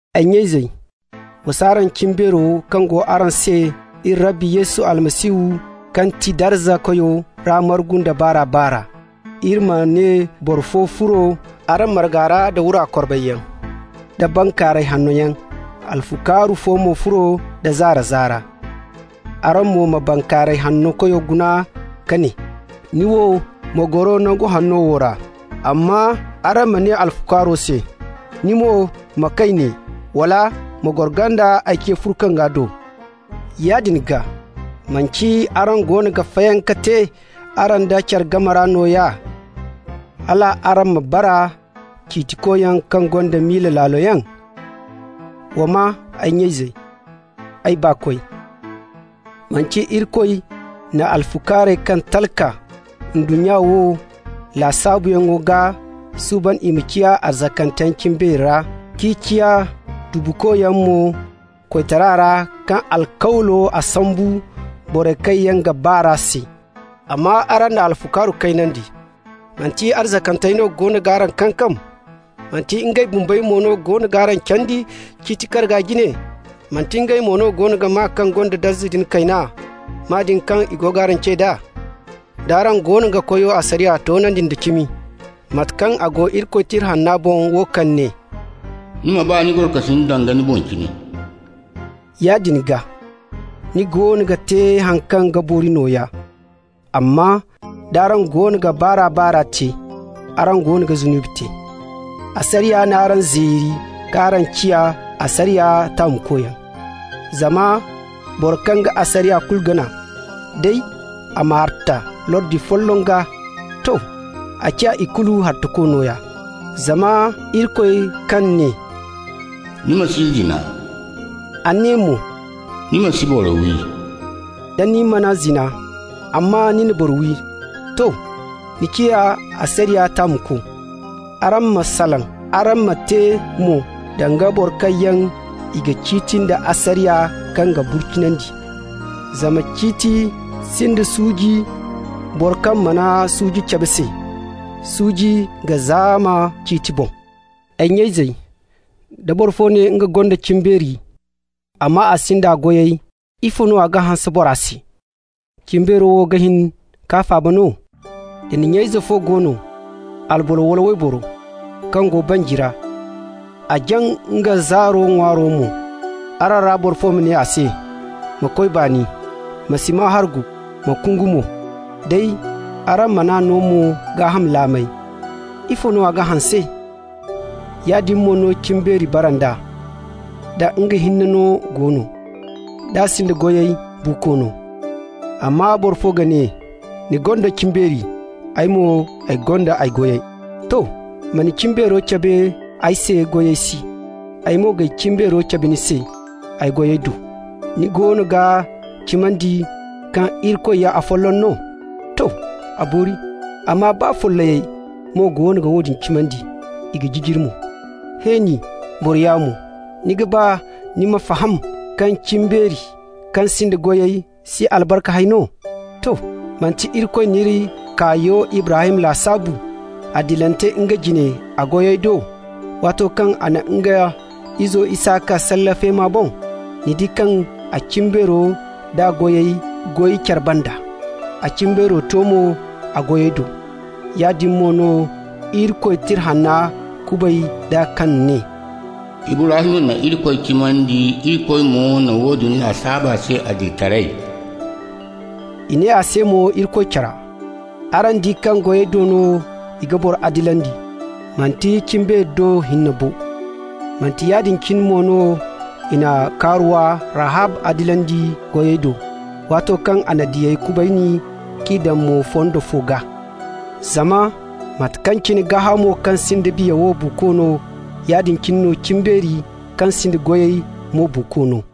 Ay nya-izey, wa s'araŋ cimbeero kaŋ go araŋ se iri Rabbi Yesu Almasihu kaŋ ti darza Koyo ra margu nda baar'a-baar'a. Iri ma ne boro fo furo araŋ marga ra da wura korbayyaŋ da bankaaray hanno yaŋ, alfukaaru fo mo furo nda zaara-zaara. Araŋ mo ma bankaaray hanno koyo guna ka ne: «Ni wo, ma goro nangu hanno wo ra». Amma araŋ ma ne alfukaaro se: «Ni mo, ma kay ne,» wala: «Ma goro ganda ay ce furkanga do». Yaadin gaa, manti araŋ goono ga fayanka te araŋ da care game ra nooya, hal araŋ bara ciitikoyaŋ kaŋ gonda miila laalo yaŋ? Wa maa, ay nya-izey, ay baakoy, manti Irikoy na alfukaarey kaŋ talka ndunnya wo lasaabuyaŋ gaa suuban i ma ciya arzakanteyaŋ cimbeeri ra, k'i ciya tubukoyaŋ mo koytara ra kaŋ alkawlo a sambu borey kaŋ yaŋ ga ba r'a se? Amma araŋ na alfukaaru kaynandi. Manti arzakantey no goono g'araŋ kankam? Manti ngey bumbey mo no goono g'araŋ candi ciiti karga jine? Manti ngey mo no goono ga maa kaŋ gonda darza din kayna, maa din kaŋ i go g'araŋ ce d'a? D'araŋ goono ga Koyo asariya toonandi nda cimi, mate kaŋ a go Irikoy Tira Hanna boŋ, wo kaŋ ne: «Ni ma ba ni gorokasin danga ni boŋ cine», yaadin gaa ni goono ga te haŋ kaŋ ga boori nooya. Amma d'araŋ goono ga baar'a-baar'a te, araŋ goono ga zunubi te. Asariya n'araŋ zeeri k'araŋ ciya asariya taamukoyaŋ. Zama boro kaŋ ga asariya kulu gana, day a ma harta lordi folloŋ gaa, to, a ciya ikulu hartako nooya. Zama Irikoy kaŋ ne: «Ni ma si zina,» a ne mo: «Ni ma si boro wi.» Da ni mana zina, amma ni na boro wi, to, ni ciya asariya taamuko. Araŋ ma salaŋ, araŋ ma te mo, danga boro kaŋ yaŋ i ga ciiti nda asariya kaŋ ga burcinandi. Zama ciiti sinda suuji boro kaŋ mana suuji cabe se. Suuji ga zaama ciiti boŋ. Ay nya-izey, da boro fo ne nga gonda cimbeeri amma a sinda a goyey, ifo no a ga hanse bora se? Cimbeero wo ga hin k'a faaba no? Da nya-ize fo go no, alboro wala wayboro, kaŋ go banji ra, a jaŋ nga zaaro ŋwaaro mo, araŋ ra boro fo ma ne a se: «Ma koy baani. Ma si maa hargu, ma kungu mo!» day araŋ man'a no mo gaaham laamey, ifo no a ga hanse? Yaadin mo no cimbeeri bara nd'a, da nga hinne no go no. D'a sinda goyey, buuko no. Amma boro fo ga ne: «Ni gonda cimbeeri, ay mo ay gonda a goyey.» To. Ma ni cimbeero cabe ay se goyey si, ay mo g'ay cimbeero cabe ni se ay goyey do. Ni goono ga cimandi kaŋ Irikoy ya afolloŋ no? To, a boori! Amma baa follayey mo goono ga woodin cimandi, i ga jijiri mo. He nin, boro yaamo, ni ga ba ni ma faham kaŋ cimbeeri kaŋ sinda goyey si albarka hay no? To! Manti Irikoy n'iri kaayo Ibrahim lasaabu adilante nga jine a goyey do waato kaŋ a na nga izo Isaka salle feema boŋ? Ni di kaŋ a cimbeero d'a goyey goy care banda. A cimbeero to mo a goyey do. Yaadin mo no Irikoy Tira Hanna kubay d'a kaŋ ne: «Ibrahim na Irikoy cimandi, Irikoy mo na woodin lasaabu a se adilitaray.» I ne a se mo Irikoy cora. Araŋ di kaŋ goyey do no i ga boro adilandi, manti cimbeeri do hinne bo. Manti yaadin cine mo no i na kaaruwa Rahab adilandi goyey do, waato kaŋ a na diyey kubayni k'i daŋ mo fondo fo gaa. Zama mate kaŋ cine gaahamo kaŋ sinda biya wo buuko no, yaadin cine no cimbeeri kaŋ sinda goyey mo buuko no.